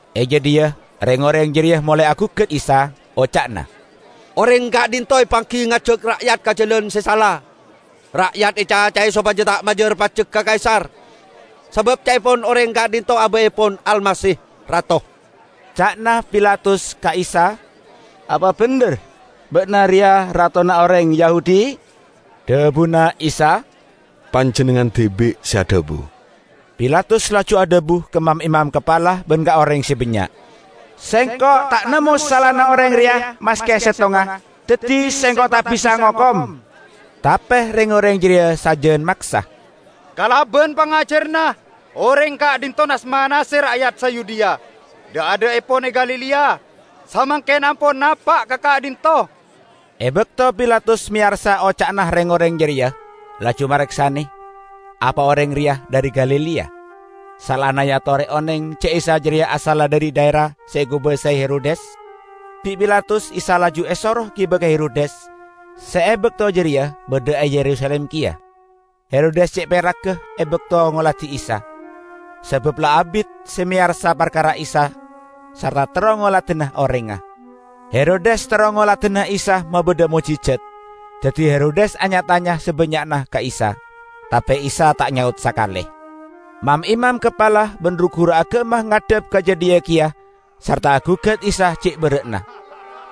E jadhiya reng-oreng jareya molae agugat Isa, oca'na, "Oreng ka'dhinto' epanggi ngajak ra'yat ka jalan se sala. Ra'yat ecacae sopaja ta' majar pajek ka Kaisar, sabab ca'epon oreng ka'dhinto' aba'epon Almasih, rato." Ca'na Pilatus ka Isa, "Apa bendher ba'na reya ratona oreng Yahudi?" Dhabuna Isa, "Panjennengngan dibi' se adhabu." Pilatus laju adhabu ka mam-imam kapala ban ka oreng se bannya', "Sengko' ta' nemmo salana oreng reya maske settonga, daddi sengko' ta' bisa ngokom." Tape reng-oreng jareya sajan maksa, "Kalaban pangajaranna, oreng ka'dhinto' nas-manase ra'yat sa Yudea; dha'-adha'epon e Galilea, samangken ampon napa' ka ka'dhinto'." E bakto Pilatus meyarsa oca'na reng-oreng jareya, laju mareksane, "Apa oreng reya dhari Galilea?" Saellana eatore oneng ja' Isa jareya asalla dhari dhaera se ekobasae Herodes, bi' Pilatus Isa laju esoro giba ka Herodes, se e bakto jareya badha e Yerusalim keya. Herodes ce' peragga e bakto ngoladi Isa, sabab la abit se meyarsa parkara Isa sarta terro ngoladana orengnga. Herodes terro ngoladana Isa mabadha mo'jijat. Daddi Herodes anya-tanya sabannya'na ka Isa, tape Isa ta' nyaot sakale. Mam-imam kapala ban ru-guru agama ngadhep ka jadhiya keya sarta agugat Isa ce' berra'na.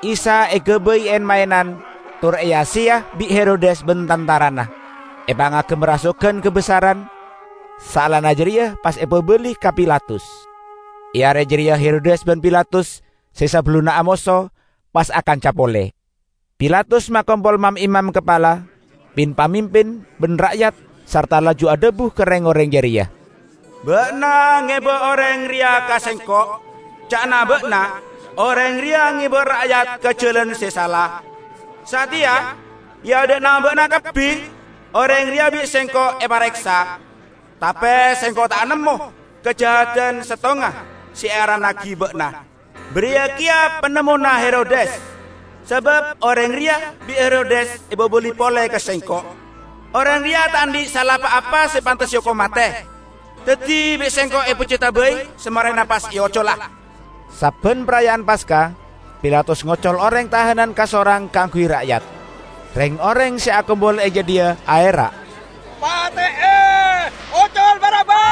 Isa egabay en-maenan tor eya-seya bi' Herodes ban tantarana, epangagem rasogan kabessaran, saellana jareya pas epabali ka Pilatus. E are jareya Herodes ban Pilatus se sabellunna amoso, pas akanca pole. Pilatus makompol mam-imam kapala, pin-pamimpin, ban ra'yat, sarta laju adhabu ka reng-oreng jareya, "Ba'na ngeba oreng reya ka Sengko'; ca'na ba'na oreng reya ngeba ra'yat ka jalan se sala. Sateya e adha'na ba'na kabbi oreng reya bi' sengko' epareksa, tape sengko' ta' nemmo kajahadan settonga se earannagi ba'na. Bariya keya panemmona Herodes, sabab oreng reya bi' Herodes epabali pole ka sengko'. Oreng reya ta' andhi' sala pa-apa se pantes eokom mate. Daddi bi' sengko' epeccoda bai, samarena pas eocola." [ Sabban paraya'an Paska, Pilatus ngocol oreng tahanan kasorang kaangguy ra'yat.] Reng-oreng se akompol e jadhiya aera', "Pate'e! Ocol Barabbas!" (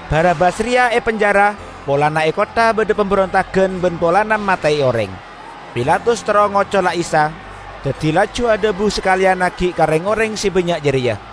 Barabbas reya epenjara polana e kottha badha pamberontagan ban polana mate'e oreng.) Pilatus terro ngocola Isa, daddi laju adhabu sakaleyan aggi' ka reng-oreng se bannya' jareya.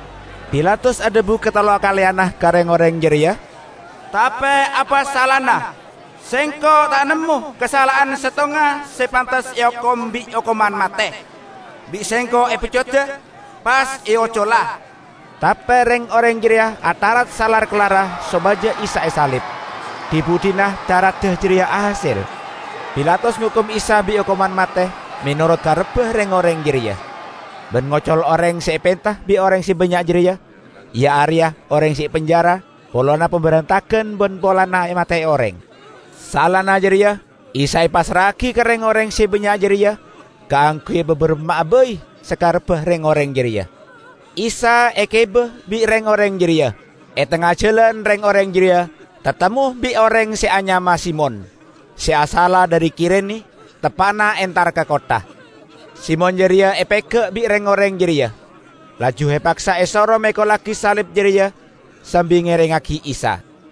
Pilatus adhabu katellokaleyanna ka reng-oreng jareya, "Tape apa salana? Sengko' ta' nemmo kasala'an settonga se pantes eokom bi' okoman mate! Bi' sengko' epeccoda, pas eocola." Tape reng-oreng jareya atharat salar-kellarra sopaja Isa esalib. Dhi-budhina tharadda jareya ahasel. Pilatus ngokom Isa bi' okoman mate menorot karebba reng-oreng jareya, ban ngocol oreng se epenta bi' oreng se bannya' jareya, iya areya oreng se epenjara polana pamberontagan ban polana mate'e oreng. Saellana jareya Isa epassra'agi ka reng-oreng se bannya' jareya kaangguy epabaramma'a bai sakarebba reng-oreng jareya. Isa egiba bi' reng-oreng jareya. E tengnga jalan reng-oreng jareya tatemmo bi' oreng se anyama Simon, se asalla dhari Kirene, teppa'na entara ka kottha. Simon jareya epega' bi' reng-oreng jareya, laju epaksa esoro mekollagi salib jareya sambi ngerengngagi Isa.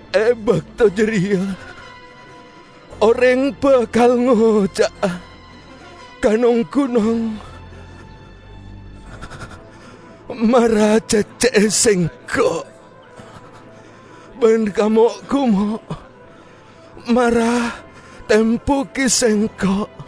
E bakto jareya oreng bakal ngoca'a ka nong-gunong, 'Mara cecce'e sengko'!' Ban ka mo'-gumo', 'Mara tembugi sengko'!'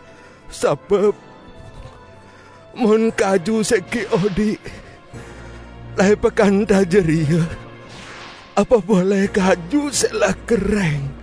Sabab mon kaju se gi' odhi' la epakantha jareya, apa pole kaju se la kerreng!"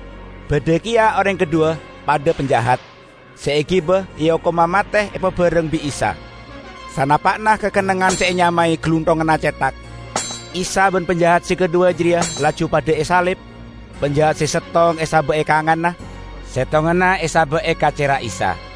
Badha keya oreng kadhuwa -- padha panjahat -- se egiba eokoma mate epabareng bi' Isa. Sanapa'na ka kennengngan se enyamae "Galunthonganna Cethak", Isa ban panjahat se kadhuwa jareya laju padha esalib; panjahat se settong esaba' e kanganna, settonganna esaba' e kacerra Isa.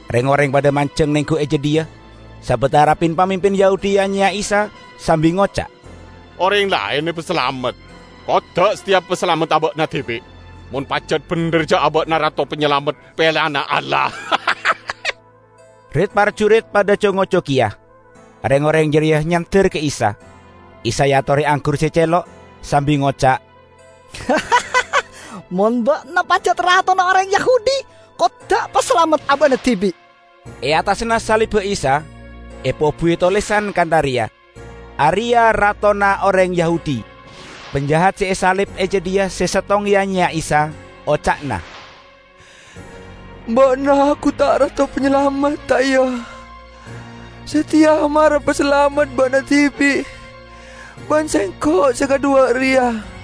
Reng-oreng padha manjeng nenggu e jadhiya, sabatara pin-pamimpin Yahudi ya-nyeya Isa sambi ngoca', "Oreng laen epasalamet; kodda' sateya pasalamet aba'na dibi', mon pajat bendher ja' aba'na Rato Panyalamet peleyanna Allah!" Rit-parjurit padha co-ngoco keya. Reng-oreng jareya nyander ka Isa. Isa eatore anggur se celo', sambi ngoca', "Mon ba'na pajat ratona oreng Yahudi, kodda' pasalamet aba'na dibi'!" E attasanna salibba Isa epobuwi tolesan kantha reya, "Areya' Ratona Oreng Yahudi!" Panjahat se esalib e jadhiya se settong ya-nyeya Isa, oca'na, "Ba'na gu ta' Rato Panyalamet ta' iya? Sateya mara pasalamet Ba'na dibi' ban sengko' se kadhuwa reya!"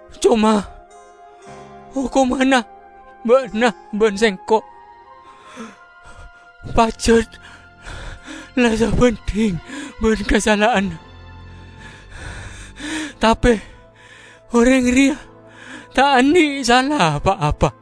Coma, okomanna ba'na ban sengko' pajat la sabandhing ban kasala'anna. Tape oreng reya ta' andhi' sala pa-apa!"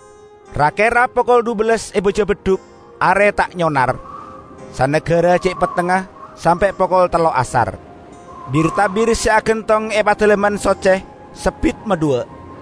Ra-kera pokol dhubellas e baja beddhuk are ta' nyonar, sanagara ce' pettengnga sampe' pokol tello' asar. Bir-tabir se agantong e Padalemman Socce sebbit madhuwa.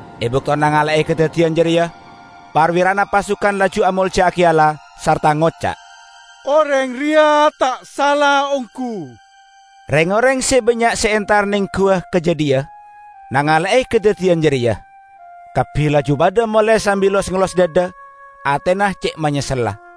E bakto nangale'e kadaddiyan jareya, parwirana pasukan laju amolja'agi Allah, sarta ngoca', "Oreng reya ta' sala onggu!" Reng-oreng se bannya' se entar nengguwa ka jadhiya, nangale'e kadaddiyan jareya. Kabbi laju padha mole sambi los-ngellos dhadha, atena ce' manyessella.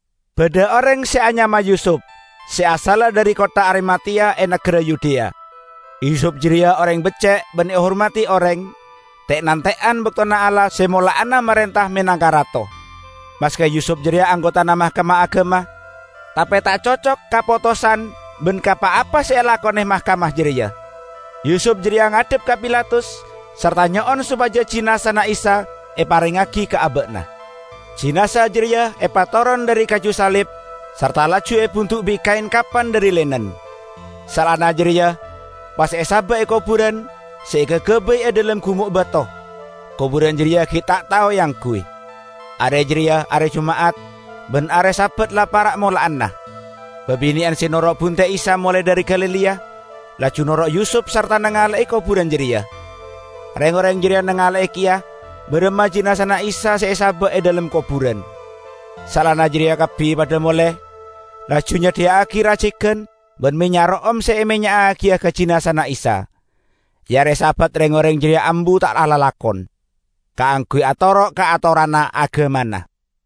Badha oreng se anyama Yusup, se asalla dhari kottha Arimateya e nagara Yudea. Yusup jareya oreng becce' ban ehormadi oreng, te'-nante'an baktona Allah se mola'ana marenta menangka Rato. Maske Yusup jareya anggotana Mahkamah Agama, tape ta' cocok ka potosan ban ka pa-apa se elakone mahkamah jareya. Yusup jareya ngadhep ka Pilatus sarta nyo'on sopaja jinazana Isa eparengngagi ka aba'na. Jinaza jareya epatoron dhari kaju salib, sarta laju ebundu' bi' kaen kapan dhari linen. Saellana jareya pas esaba' e koburan se ekagabay e dhalem gumo' bato -- koburan jareya gi' ta' tao eangguy. Are jareya are Juma'at; ban are Sabat la para' mola'ana. Babine'an se noro' bunte' Isa molae dhari Galilea laju noro' Yusup sarta nangale'e koburan jareya. Reng-oreng jareya nangale'e keya baramma jinazana Isa se esaba' e dhalem koburan. Saellana jareya kabbi padha mole, laju nyadhiya'agi racegan ban mennya' ro'om se emennya'agiya ka jinazana Isa. E are Sabat reng-oreng jareya ambu ta' alalakon, kaangguy atoro' ka atoranna agamana.